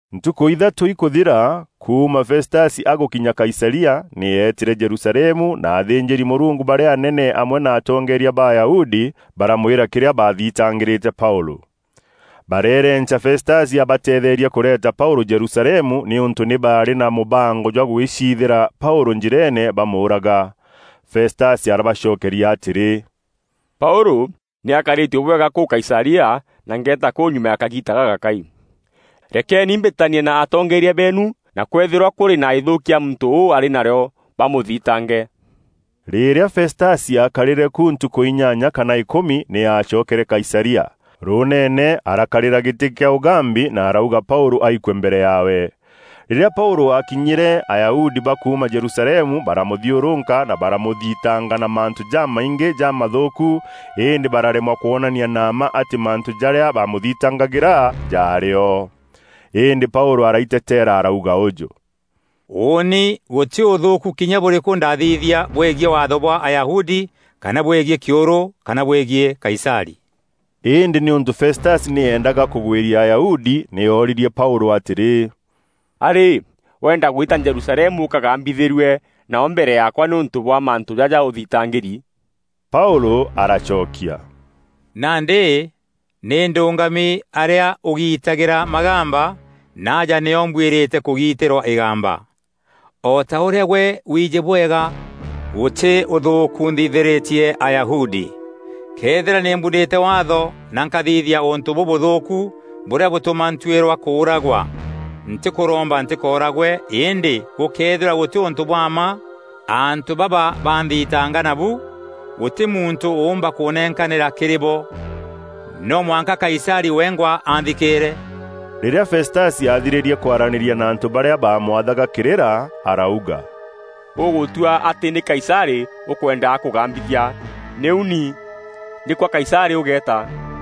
Ntukû ithatû ikûthira kuuma Festasi agûkinya Kaisaria, nî eetîre Jerusalemu na athînjîri-Mûrungu barîa anene amwe na atongeeria ba Ayahudi baramwîra kîrîa baathitangîrîte Paûlû. Bareerenca Festasi abateetherie kûreeta Paûlû Jerusalemu nîûntû nî barî na mûbango jwa gwiciithîra Paûlû njîreene bamûûraga. Festasi arabacokeria atîrî, “Paûlû nî akarîtue bwega kûu Kaisaria na ngeeta kûu nyuma ya kagiita gagakai. Rekeeni mbîtanie na atongeeria beenu na kwëethîrwa kûrî na îthûûkia muntû ûu arî narîo bamûthitange.” Rîrîa Festasi aakarîre ku ntukû inyanya kana îkûmi nî aacokere Kaisaria. Rûûneene arakarîra gîtî kîa ûgambi na arauga Paûlû aikue mbere yaawe. Rîrîa Paûlû aakinyîre, Ayahudi ba kuuma Jerusalemu baramûthiûrûka na baramûthitanga na mantû jamaingî jamathûûku îndî bararemwa kwonania na mma atî mantû jarîa baamûthitangagîra jarî o. Îndî Paûlû araiteteera arauga ûjû, “Ûûni gûtî ûthûûku kinya bûrîkû ndaathithia bwegiî waatho bwa Ayahudi kana bwegiî kîûrû kana bwegiî Kaisarî.” Îndî nîûntû Festasi nî eendaga kûgwîria Ayahudi nî oorîrie Paûlû atîrî, “A-rî, weenda gwîta Jerusalemu ûkagambîthîrue nao mbere yaakwa nîûntû bwa mantû jaja ûthitangîri?” Paûlû aracokia, “Nandî nî ndûngami arîa ûgiitagîra magamba, na aja nîo mbwîrîte kûgiitîrwa îgamba. O ta ûrîa gwe wiijî bwega, gûtî ûthûûku nthithîrîtie Ayahudi. Këethîra nî mbunîte Waatho na nkathithia ûntû bûûthûûkû bûrîa bûtûma ntuîrwa kûûragwa, ntîkûromba ntîkooragwe îndî gûkëethîrwa gûtî ûntû bwa mma antû baba banthitanga nabu, gûtî muntû ûûmba kûnenkanîra kîrî bo. No mwanka Kaisarî wengwa anthikîîre!” Rîrîa Festasi athirîrie kwaranîria na antû barîa baamwathaga kîrîra, arauga, “Ûgûtua atî nî Kaisarî ûkwenda akûgambithia; nîu ni, nî kwa Kaisarî ûgeeta.”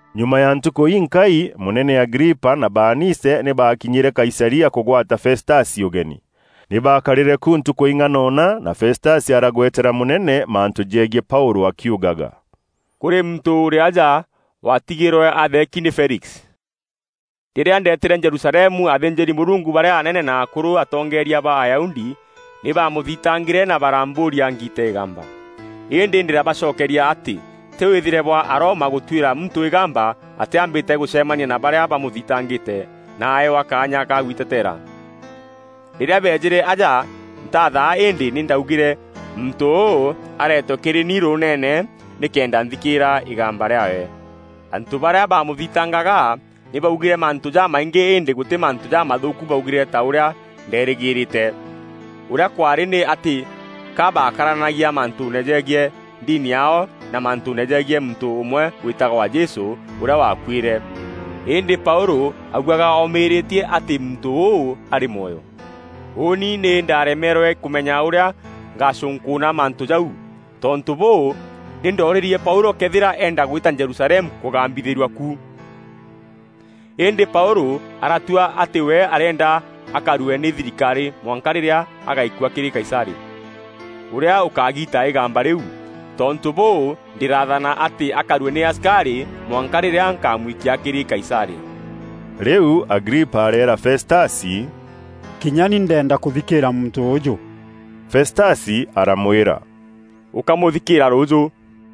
Nyuma ya ntukû inkai, mûnene Agripa na Baanice nî baakinyîre Kaisaria kûgwata Festasi ûgeni. Nî baakarîre ku ntukû ing'anona na Festasi aragwetera mûnene mantû jegiî Paûlû akiugaga, “Kûrî muntû ûrî aja waatigîrwe atheeki nî Felix. Rîrîa ndeetîre Jerusalemu athînjîri-Mûrungu barîa anene na akûrû atongeeria ba Ayahudi nî baamûthitangîre na barambûûria ngiite îgamba. Îndî ndîrabacokeria atî tî wîthîre bwa Aroma gûtuîra muntû îgamba atîambîte gûcemania na barîa bamûthitangîte na aewa kaanya ga gwitetera. Rîrîa beejîre aja, ntaathaa îndî nî ndaugîre muntû ûu areetwe kîrî ni rûûneene nîkenda nthikîîra îgamba rîaawe. Antû barîa baamûthitangaga nî baugîre mantû jamaingî îndî gûtî mantû jamathûûku baugîre ta ûrîa ndeerîgîîrîte. Ûrîa kwaarî nî atî ka bakararanagia mantûûne jegiî ndini yaao na mantûûne jegiî muntû ûmwe wîtagwa Jesû ûrîa waakuîre, îndî Paûlû augaga oomîrîtie atî muntû ûu arî mwoyo. Ûûni nî ndaaremerwe kûmenya ûrîa ngacûnkûûna mantû jau. Tontû bûû, nî ndoorîrie Paûlû këethîra eenda gwîta Jerusalemu kûgambithîrua ku. Îndî Paûlû aratua atî we arîenda akarue nî thirikarî mwanka rîrîa agaikua kîrî Kaisarî, ûrîa ûkagiita îgamba rîu. Tontû bûû, ndîraathana atî akarue nî asikarî mwanka rîrîa nkamwikia kîrî Kaisarî.” Rîu Agripa areera Festasi, “Kinya ni ndeenda kûthikîîra muntû ûûjû.” Festasi aramwîra, “Ûkamûthikîîra rûûjû.”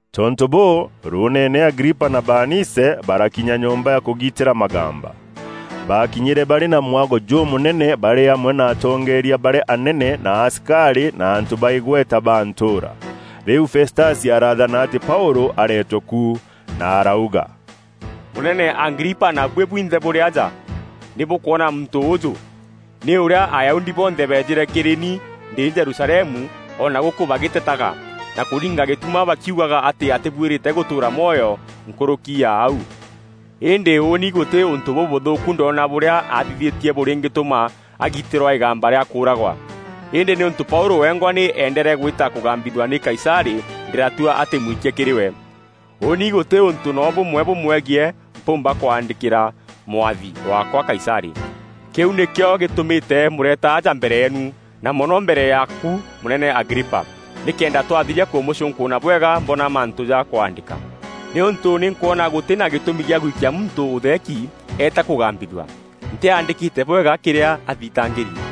Tontû bûû, rûûneene Agripa na Baanice barakinya nyomba ya kûgiitîra magamba. Baakinyîre barî na mwago jûmûnene barî amwe na atongeeria barîa anene na asikarî na antû ba îgweta ba ntûûra. Rîu Festasi araathana atî Paûlû areetwe ku na arauga, “Mûnene Agripa na buî bwinthe bûrî aja: nî bûkwona muntû ûûjû, nî ûrîa Ayahudi bonthe beejîre kîrî ni ndî Jerusalemu o na gûkû bagîtetaga na kûringa gîtuma bakiugaga atî atîbuîrîte gûtûûra mwoyo nkûrûki ya au. Îndî ûûni gûtî ûntû bûbûthûûku ndoona bûrîa athithîtie bûringîtûma agiitîrwa îgamba rîa kûûragwa. Îndî nîûntû Paûlû wengwa nî eendere gwîta kûgambithua nî Kaisarî, ndîratua atî mwikie kîrî we. Ûûni gûtî ûntû noo bûmwe bûmwegiî mpûûmba kwaandîkîra mwathi waakwa Kaisarî. Kîu nîkîo gîtûmîte mûreta aja mbere yeenu, na mono mbere yaaku mûnene Agripa, nîkenda twathiria kûmûcûnkûûna bwega, mboona mantû ja kwaandîka. Nî ûntû nî nkwona gûtî na gîtûmî gîa gwikia muntû ûtheeki, eeta kûgambithua, ntîaandîkîte bwega kîrîa athitangîri.”